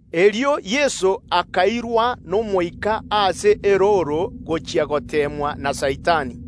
Erio Yeso akaragwa n’Omoika gochia ase erooro gochia goteemwa na Saitani.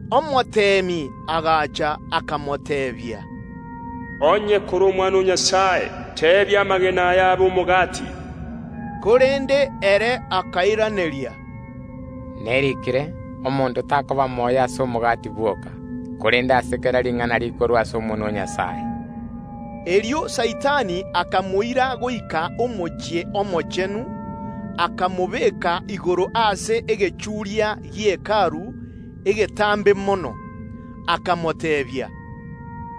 Omoteemi agacha, akamoteebia, “Onye aye kore Omwana o Nyasae, teebia amagena aya abe omogati.” Korende Yeso akairaneria, “Neriikire: Omonto takomenya ase omogati bwoka, korende ase kera ring’ana rikorwa ase omonwa o Nyasae.” Erio Saitani akamoira goika Yerusalemu omochie omochenu, akamobeka igoro ase egechuuria egetambe mono gie Hekalu. Akamoteebia,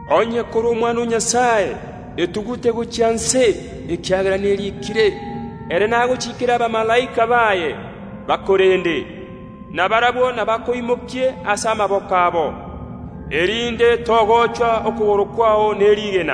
Onye aye kore Omwana o Nyasae, etugute gochia inse, ekiagera neriikire Nyasae nagochiikere abamalaika baye bakorende, na barabwo nabakoimokie ase amaboko abo, erinde togochwa okogoro kwao ne rigena.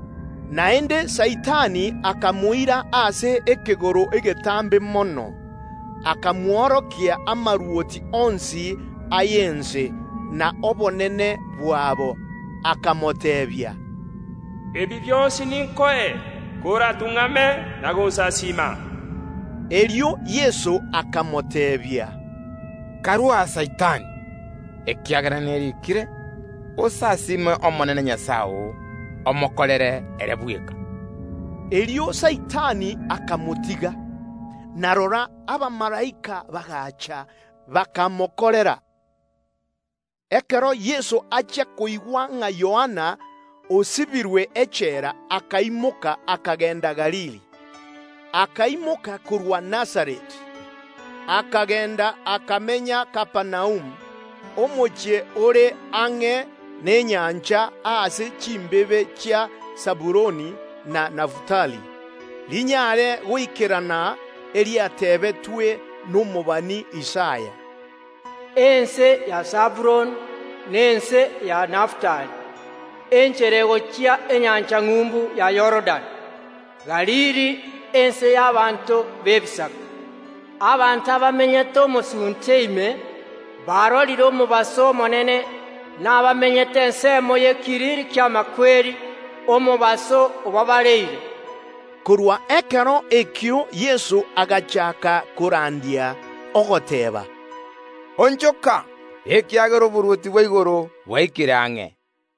Naende Saitani akamoira ase ekegoro egetambe mono, akamworokia amarwoti onsi y’ense, na obonene bwabo, akamoteebia, “Ebi bionsi ninkoe, koratung’amere onsasiime.” Erio Yeso akamoteebia, Karue aa, Saitani! Ekiagera neriikire, “Osasiime Omonene Nyasae oo, omokorere ere bweka.” Erio Saitani akamotiga, na rora, abamalaika bagaacha, bakamokorera. Ekero Yeso achia koigwa ng’a Yohana osibirwe echela, akaimoka, akagenda Galili. Akaimoka korwa Nazareti, akagenda, akamenya Kapernaumu, omochie ore ang’e n’enyancha ase chimbebe chia Sabuloni na Nafutali, rinyare goikerana eriatebetwe nomobani Isaya, “Ense ya Sabuloni na ense ya Nafutali, enchera egochia enyancha ng’umbu ya Yorodani, Galili, ense y’ abanto b’Ebisaku, abanto abamenyete omosunte ime, barorire omobaso omonene, na abamenyete ensemo y’ekiriri ki’amakweri, omobaso obabareire.” Korwa ekero ekio Yeso agachaaka korandia, ogoteeba, “Onchoka, ekiagera oborwoti bwa igoro bwaikire ang’e.”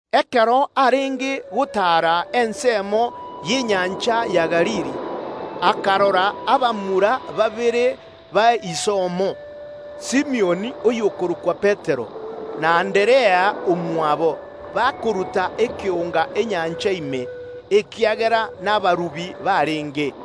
Ekero Yeso arenge gotaara ase engegu y’enyancha ya Galili, akarora abamura babere bamwabo abwo barenge abarubi, Simioni (oyokorokwa Petero), na Anderea omwabo, bakoruta ekeonga enyancha ime, erio barube chinswe.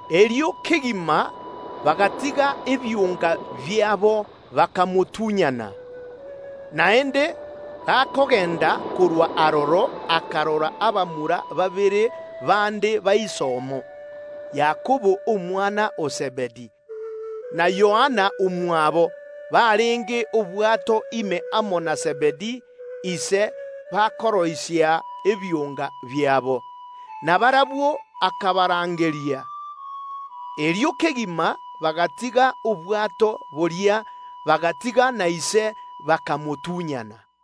Erio agwo kegima bagatiga ebionga biabo, bakamotunyana. Erio akagenda gochia motwe korwa aroro, akarora abamura babere bande bamwabo, Yakobo omwana o Zebedi, na Yohana omwabo, barenge obwato ime amo na Zebedi ise bakoroisia ebionga biabo, na barabwo akabarangeria. Erio kegima bagatiga obwato boria, bagatiga na ise, bakamotunyana.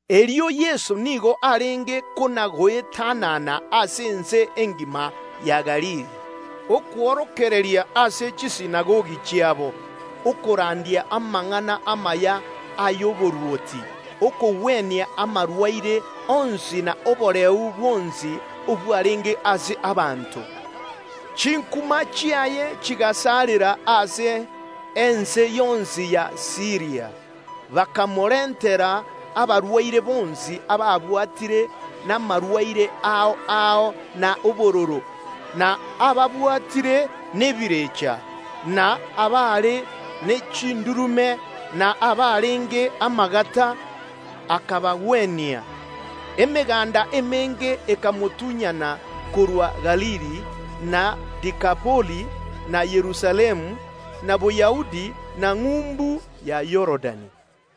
Yeso nigo arenge kona goetanana ase ense engima ya Galili, okworokereria ase chisinagogi chiabo, okorandia amang’ana amaya y’oborwoti, okogwenia amarwaire onsi na oboreu bwonsi obwarenge ase abanto. Chinkuma chiaye chigasarera ase ense yonsi ya Siiria; bakamorentera abarwaire bonsi ababwatire namarwaire ao ao, y’obosareru, na ababwatire n’ebirecha, na abaare ne chindurume, na abarenge amagata, akabagwenia. Emeganda emenge ekamotunyana korwa Galili, na Dekapoli, na Yerusalemu, na Boyahudi, na ng’umbu ya Yorodani.